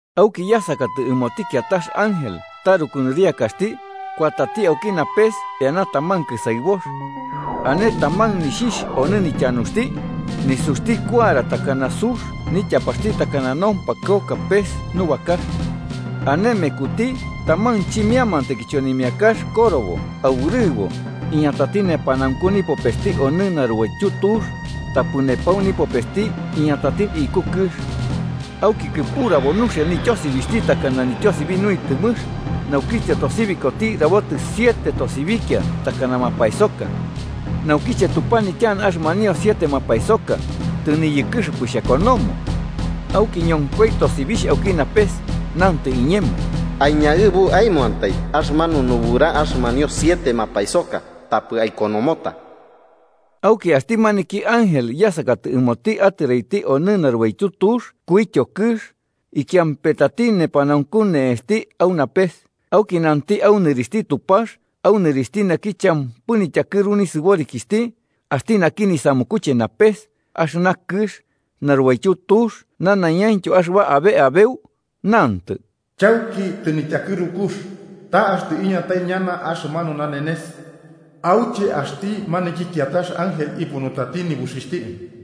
Auki yasakatɨ ɨmoti kiatax ángel taruku nɨriakaxti, kuatati auki napes eana taman kɨsaɨbox. Ane taman nixhixh onɨ nityanuxti, nisuxti kuara takana sux nityapaxti takana nompakɨoka pes nubakax. Ane mekuti taman chimiamantai kichonimiakax korobo aurɨbo, iñatati nepanaunku nipopesti onɨ narubaityu tux, tapɨ nepau nipopesti iñatati iku kɨx. Auki kɨpurabo nuxia nityosibixhti, takana nityosibi nuitɨmɨx, naukiche tosibikoti rabotio siete tosibikia takana mapaesoka. Naukiche tupanityana axɨmanio siete mapaesoka, tɨniyɨkɨxɨpɨ xhakonomo. Auki ñonkoi tosibixh auki napes, nantɨ iñemo: “Aiñaɨbu aemoantai axɨmanu nubura axɨmanio siete mapaesoka, tapɨ aikonomota.” Auki axti maniki ángel yasakatɨ ɨmoti atɨraiti onɨ narubaityu tux ikuityo kɨx, ikiampetati nepanaunku ne'esti au napes auki nanti au nɨrixhti Tupax au nɨrixhti naki champɨ nityakɨru nisɨborikixhti, axti naki nisamukuche napes, axɨna kɨx, narubaityu tux nanaiñaintyo axɨba abe ubau. Nanti: “Chauki tɨnityakɨrux, ta axtɨ iñatai ñana axɨmanu nanenes auche axti maniki kiatax ángel ipunutati nibuxixhti,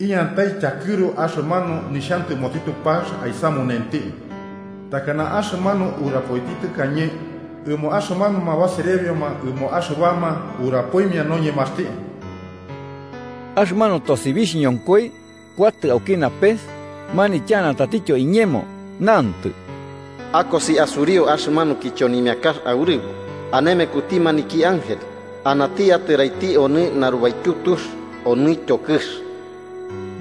iñatai tyakɨru axɨmanu nixhantɨmoti Tupax aisamunenti, takana axɨmanu urapoiti tɨkañe ɨmo axɨmanuma baserebioma ɨmo axɨbama urapoimia noñemaxti.” Axɨmanu tosibixh ñonkoi, kuatɨ auki napes, manityana tatityo iñemo, nantɨ: “Akosi asuriu axɨmanu kichonimiakax aurɨbo ane mekuti maniki ángel anati atɨraiti onɨ narubaityu tux onɨtyo kɨx.”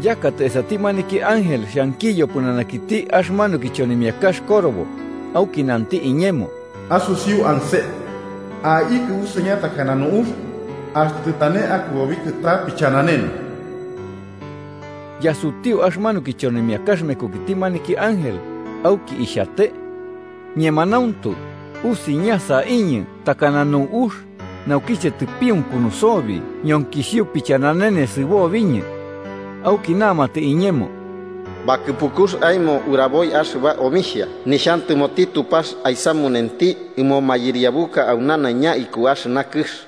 Yakatɨ esati maniki ángel xhankiyo pɨnanakiti axɨmanu kichonimiakax korobo, auki nanti iñemo: “Asusiu anse. Aikɨ usiña takana nu'ux, axtɨ tɨtane akɨbobikɨ ta pichananene.” Yasutiu axɨmanu kichonimiakax mekukiti maniki ángel, auki ixhate. Ñemanauntu, usiña saiñɨ takana nu'ux, naukiche tɨpiunkunu sobi ñonkisio pichananene sɨbobiñɨ. Auki namatɨ iñemo: “Bakɨpukux aemo uraboi axɨba omixhia nixhantɨmoti Tupax aisamunenti ɨmo mayɨriabuka au nanaiña iku axɨna kɨx.”